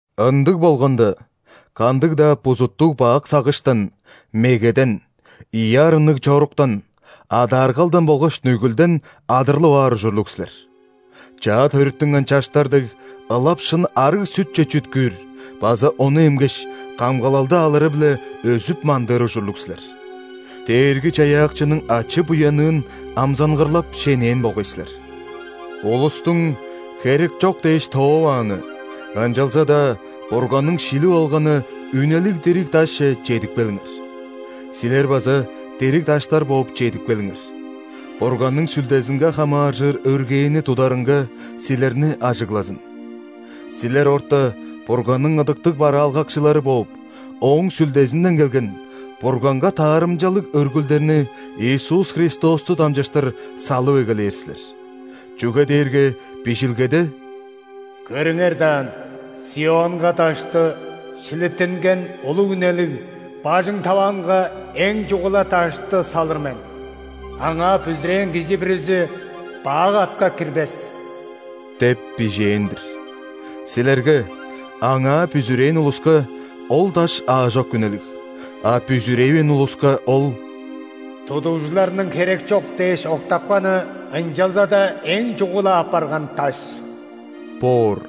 Ындыг болганда, кандыг-даа бузуттуг-бак сагыштан: мегеден, ийи арынныг чоруктан, адааргалдан болгаш нүгүлден адырлып аар ужурлуг силер. Чаа төрүттүнген чаштар дег, ылап шын арыг сүтче чүткүүр база ону эмгеш, камгалалды алыры-биле өзүп-мандыыр ужурлуг силер. Дээрги-Чаяакчының ачы-буянныын амзангырлап шенээн болгай силер. Улустуң херекчок дээш тоовааны, ынчалза-даа Бурганның шилип алганы үнелиг дириг Дашче чедип келиңер. Силер база дириг даштар бооп чедип келиңер, Бурганның Сүлдезинге хамааржыр өргээни тударынга силерни ажыглазын. Силер орта Бурганның ыдыктыг бараалгакчылары бооп, Ооң Сүлдезинден келген, Бурганга таарымчалыг өргүлдерни Иисус Христосту дамчыштыр салып эгелээр силер. Чүге дээрге Бижилгеде:«Көрүңер даан, ·Сионга дашты –шилиттинген, улуг үнелиг, бажың таваанга эң чугула дашты салыр мен.Аңаа бүзүрээн кижи бүрүзү бак атка кирбес» деп бижээн-дир. Силерге, Аңаа бүзүрээн улуска, ол Даш аажок үнелиг, а бүзүревээн улуска Ол«Тудугжуларның херекчок дээш, октапканы,ынчалза-даа эң чугула апарган даш» боор.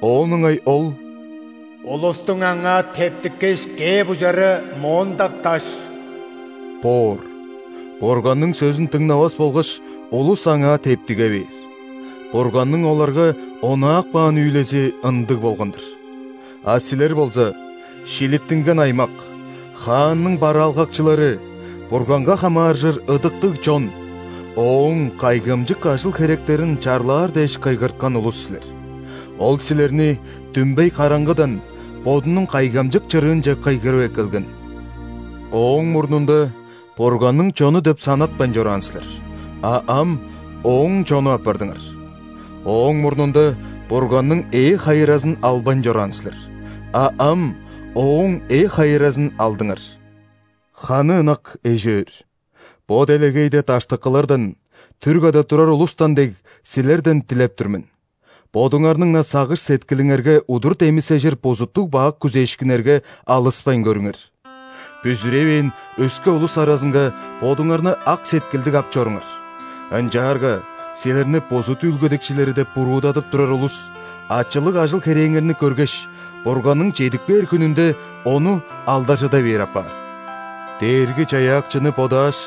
Оон ыңай Ол«Улустуң аңаа тептиккеш, кээп ужары моондак даш» боор. Бурганның сөзүн дыңнавас болгаш, улус аңаа тептиге бээр. Бурганның оларга онаап каан үүлези ындыг болган-дыр. А силер болза – шилиттинген аймак, Хаанның бараалгакчылары, Бурганга хамааржыр ыдыктыг чон, Ооң кайгамчык ажыл-херектерин чарлаар дээш кыйгырткан улус силер. Ол силерни дүмбей караңгыдан Бодунуң кайгамчык чырыынче кыйгырып эккелген. Ооң мурнунда Бурганның чону деп санатпайн чораан силер, а ам Ооң чону апардыңар. Ооң мурнунда Бурганның ээ-хайыразын албайн чораан силер, а ам Ооң ээ-хайыразын алдыңар. Ханы ынак эш-өөр, бо делегейде даштыкылардан, түр када турар улустан дег, силерден дилеп тур мен: бодуңарның-на сагыш-сеткилиңерге удур демисежир бузуттуг-бак күзээшкиннерге алыспайн көрүңер. Бүзүревээн өске улус аразынга бодуңарны ак сеткилдиг ап чоруңар, ынчаарга силерни бузут үүлгедикчилери деп буруудадып турар улус, ачылыг ажыл-херээңерни көргеш, Бурганның чедип кээр хүнүнде Ону алдаржыда бээр апаар. Дээрги-Чаяакчыны бодааш,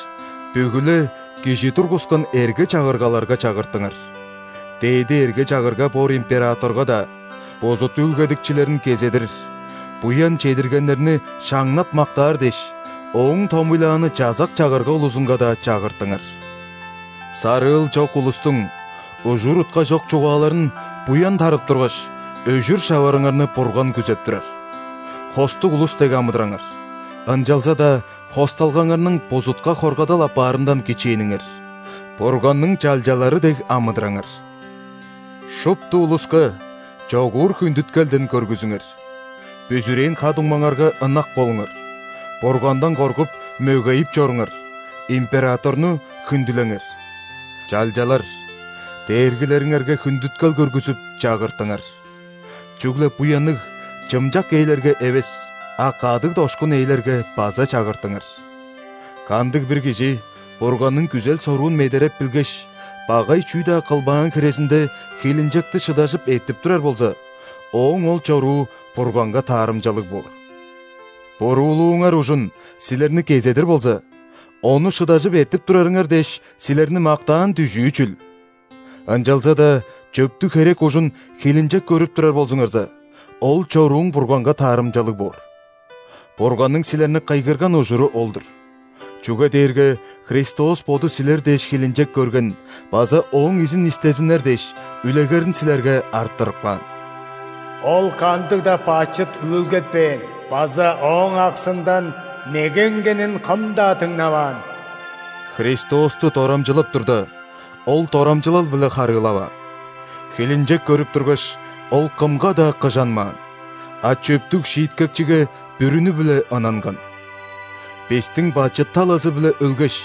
бүгү-ле кижи тургускан эрге-чагыргаларга чагыртыңар. Дээди эрге-чагырга боор императорга-даа, бузут үүлгедикчилерин кезедир, буян чедиргеннерни шаңнап-мактаар дээш, ооң томуйлааны чазак-чагырга улузунга-даа чагыртыңар. Сарыыл чок улустуң ужур-утка чок чугааларын, буян тарып тургаш, өжүр шаварыңарны Бурган күзеп турар. Хостуг улус дег амыдыраңар, ынчалза-даа хосталгаңарның бузутка хоргадал апаарындан кичээниңер, Бурганның чалчалары дег амыдыраңар. Шупту улуска чогуур хүндүткелден көргүзүңер, бүзүрээн ха-дуңмаңарга ынак болуңар, Бургандан коргуп, мөгейип чоруңар, императорну хүндүлеңер. Чалчалар, дээргилериңерге хүндүткел көргүзүп, чагыртыңар. Чүгле буянныг, чымчак ээлерге эвес, а кадыг-дошкун ээлерге база чагыртыңар. Кандыг-бир кижи Бурганның күзел-соруун медереп билгеш, багай чүү-даа кылбаан хирезинде, хилинчекти шыдажып эртип турар болза, ооң ол чоруу Бурганга таарымчалыг боор. Буруулууңар ужун силерни кезедир болза, ону шыдажып эртип турарыңар дээш, силерни мактаан дүжүү чүл? Ынчалза-даа чөптүг херек ужун хилинчек көрүп турар болзуңарза, ол чорууң Бурганга таарымчалыг боор. Бурганның силерни кыйгырган ужуру ол-дур, чүге дээрге Христос Боду силер дээш хилинчек көрген база Ооң изин истезиннер дээш, үлегерин силерге арттырып каан. Ол кандыг-даа бачыт үүлгетпээн базаОоң аксындан меге үнгенин кым-даа дыңнаваан. Христосту дорамчылап турда, Ол дорамчылал-биле харыылаваан. Хилинчек көрүп тургаш, Ол кымга-даа кыжанмаан, а чөптүг Шииткекчиге бүрүнү-биле ынанган. Бистиң бачыт талазы-биле өлгеш,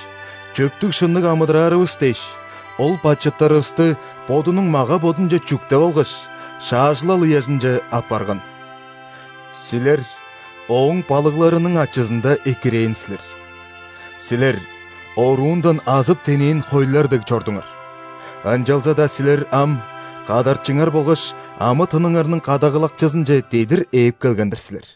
чөптүг-шынныг амыдыраарывыс дээш, Ол бачыттарывысты Бодунуң мага-бодунче чүктеп алгаш, шаажылал ыяжынче аппарган.Силер Ооң балыгларының ачызында экирээн силер. Силер оруундан азып-тенээн хойлар дег чордуңар, ынчалза-даа силер ам Кадарчыңар болгаш амы-тыныңарның Кадагалакчызынче дедир ээп келген-дир силер.